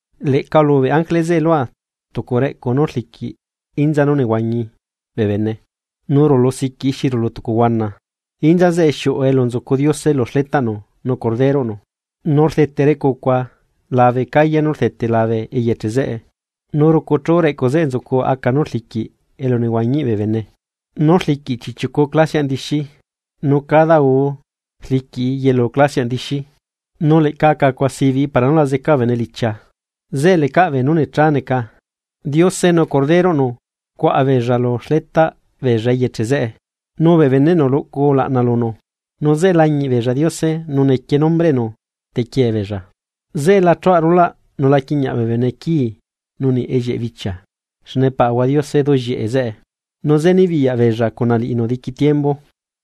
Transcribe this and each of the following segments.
Leꞌca ulubeꞌ ángele zeꞌe lua tucu reꞌcu nú rliquiꞌ inza nú nehuañi bee bene nú rulu siquiꞌ xi rulu tucu huana. Inza zeꞌe xiuꞌu elu nzucu Diose lu xletaꞌnu nu Corderoꞌnu. Nu rdete reꞌcucua labe calle nú rdete labe eyeche zeꞌe. Nu rucuchu reꞌcu zeꞌe nzucu aca nú rliquiꞌ elu nehuañiꞌ bee bene, nú rliquiꞌ chiꞌchiucu clasiaꞌ ndixi, nu cada guu rliquiꞌi yelu clasiaꞌ dixi. Nu lecaꞌ aca cuaꞌ sibiꞌ para nú rriꞌi yeca bee bene iliulabe. Zeꞌe lecaꞌ beenú necha neca, Diose nu Corderoꞌnu cuaꞌa beella lu xletaꞌ beella eyeche zeꞌe, nu bee beneꞌnu luꞌcu ulaꞌna lunu. Nu zeꞌe lañiꞌ beella Diose, nu nequie nombreꞌnu tequiee beella. Zeꞌe la chuaꞌ rulaꞌ nu la quiꞌñiaꞌ bee bene quii nu niꞌ ellieꞌ bichia xne Paꞌahua Diose duꞌllieꞌe zeꞌe, nu zeꞌe nibiyaꞌ beella cuna liꞌinu diqui tiembu.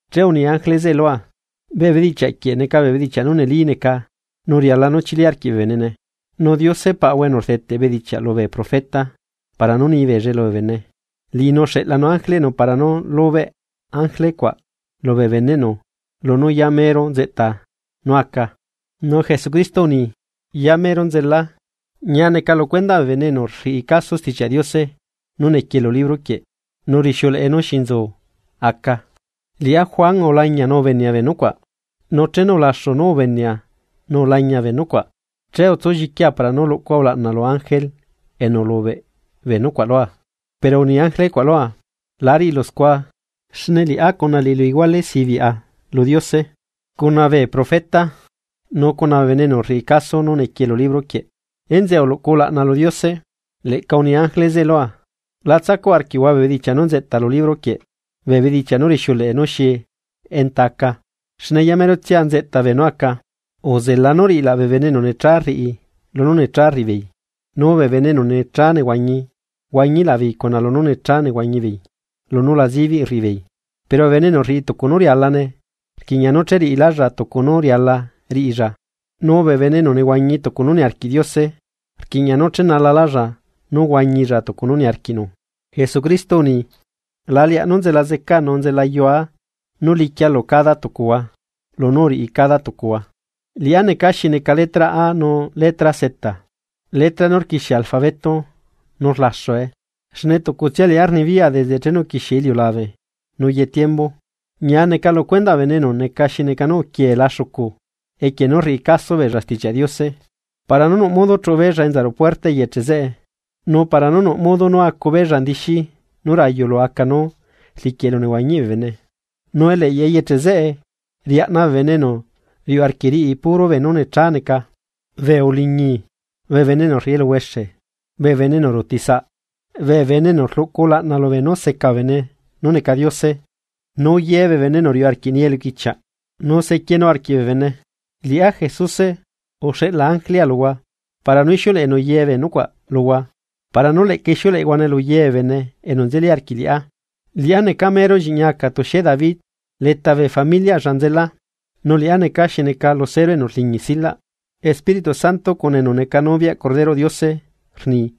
Che uni ángele zeꞌe lua: ―Bee bedichiaꞌ quieꞌ neca bee bedichiaꞌ nú neli neca nu riala nú chili arquiꞌ bee benene. Nu Diose Paꞌahua enu rdeteꞌ bedichiaꞌ lubee profeta para nú nibeella lubee bene, Liꞌinu uxeꞌlanu ángeleꞌnu para nú lubeꞌ ángele cuaꞌ lubee beneꞌnu lunú yamero nzeꞌta nú aca. Nu Jesucristo uni: ―Yamero nzela ¡Ñia neca lu cuendaꞌ bee bene enu rriꞌi caso Stichiaꞌ Diose nú nequie lu libro quieꞌ nu rixiuleꞌe nú xi nzu aca! Liꞌá Juan, ulañia nu ubenea bee nucuaꞌ, nu chenu ulaxu nú ubenea nu ulañia bee nucuaꞌ, che utsulliquia para nú luꞌcua ulaꞌna lu ángele enu ulubeꞌ bee nucuaꞌ lua. Pero uni ángele cuaꞌ lua: ―La riꞌilu scua. Xne liꞌá cuna liꞌilu iguale sibiꞌa lu Diose, cuna bee profeta nu cuna bee bene enu rriꞌi caso nú nequie lu libro quieꞌ. Enzeꞌe uluꞌcu ulaꞌna lu Diose. Leꞌca uni ángele zeꞌe lua. ―La tsacuꞌ arquiꞌhua bee bedichiaꞌ nú nzeꞌta lu libro quieꞌ, bee bedichiaꞌ nú rixiuleꞌe nú xi enta aca, xne yamerotsia nzeꞌta beenú aca. Uzela nú riꞌila bee bene enu necha rriꞌi lunú necha rriꞌi beei, nu bee bene enu necha nehuañi huañilaꞌbeei lunú necha nehuañibeei lunú la zibiꞌ rriꞌi beei. Pero bee bene enu rriꞌi tucu nú rialane rquiꞌña nú cheriꞌilálla tucu nú riala riꞌilla, nu bee bene enu nehuañi tucu nú niarquiꞌ Diose rquiꞌña nú chenalalálla nú huañilla tucu nú niarquiꞌnu. Jesucristo uni: ―La leaꞌ nú nzela zecaa nu nzelayua nú liquia lu cada tucuhua lunú uriꞌi cada tucuhua. Liꞌá neca xi neca letra A nu letra Z. Letra nú rquixie alfabeto, nu rlaxue, xne tucutsia liꞌá rnibiyaꞌa desde chenu uquixie iliulabe nu ye tiembu. Ñia neca lu cuendaꞌ bee bene enu neca xi neca nú uquieela xucu equie nú rriꞌi caso beella Stichiaꞌ Diose, para nú nuꞌ modo chuꞌu beella enza ruꞌu puerta eyeche zeꞌe nu para nú nuꞌ modo nú acu beella indixi nú rayu lu aca nú rliquiꞌ elunehuañiꞌ bee bene. Nu eleꞌyaꞌ eyeche zeꞌe riaꞌna bee bene enu riuꞌ arquiꞌ riꞌi puro beenú necha neca, bee uliñi, bee bene enu rriꞌi eluhuexe, bee bene enu ruutisaꞌ, bee bene enu rluꞌcu ulaꞌna lubeenú seca bee bene nú neca diose, nu ye bee bene enu riuꞌ arquiꞌ nii eluquichiaꞌ nu sequienu arquiꞌ bee bene. ―Liꞌá, Jesuse, uxeꞌla ángelea luhua para nú ixiuleꞌenu ye bee nucuaꞌ luhua para nú leꞌca ixiuleꞌehuane lu ye bee bene enu nzeli arquiꞌ liꞌá. Liꞌá neca mero lliꞌñi aca tuxie David, leta bee familiaꞌlla nzela. Nu liꞌá neca xi neca lucero enu rliñi silaꞌ Espíritu Santo cuna enu neca noviaꞌ Corderoꞌ Diose rni: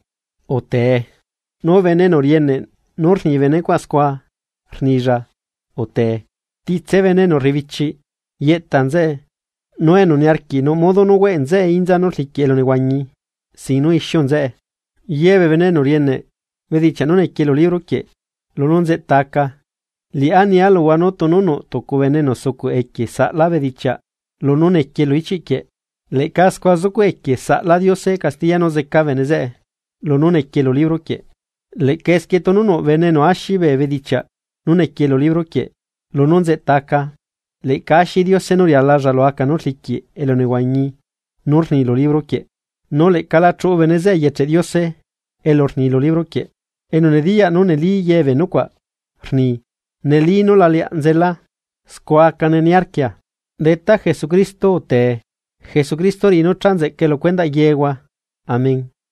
―Utee. Nu bene enu rieneꞌ nú rni bee nucuaꞌ scua rnilla: ―Utee. Titse bee enu rrebichiꞌ, yeꞌta nzeꞌe, nu enu niarquiꞌ nuꞌ modo nú hueꞌ nzeꞌe inza nú rliquiꞌ elunehuañi sin nu ixiu nzeꞌe. Ye bee bene enu rieneꞌ bedichiaꞌ nú nequie lu libro quieꞌ lunú nzeꞌta aca, liꞌá nia luhua nú tunu nuꞌ tucu bene enu sucuꞌ equie saꞌla bedichiaꞌ lunú nequie lu ichiꞌ quieꞌ, leꞌca scua zucuꞌ equie saꞌla Diose castiya nú zeca bene zeꞌe lunú nequie lu libro quieꞌ. Leꞌca esquie tunu nuꞌ bene enu axi bee bedichiaꞌ nú nequie lu libro quieꞌ lunú nzeꞌta aca, leꞌca axi Diose nú rialalla lu aca nú rliquiꞌ elu nehuañi nú rni lu libro quieꞌ, nu leꞌca la chuꞌu bene zeꞌe eyecheꞌ Diose elu rni lu libro quieꞌ. Enu nediyaꞌ nú neli ye bee nucuaꞌ, rni: ―Neli nú la leaꞌ nzela. Scua acane niarquia. ¡Detá Jesucristo, utee! Jesucristo riꞌi nú cha nzeꞌcae lu cuendaꞌ yehua. Amén.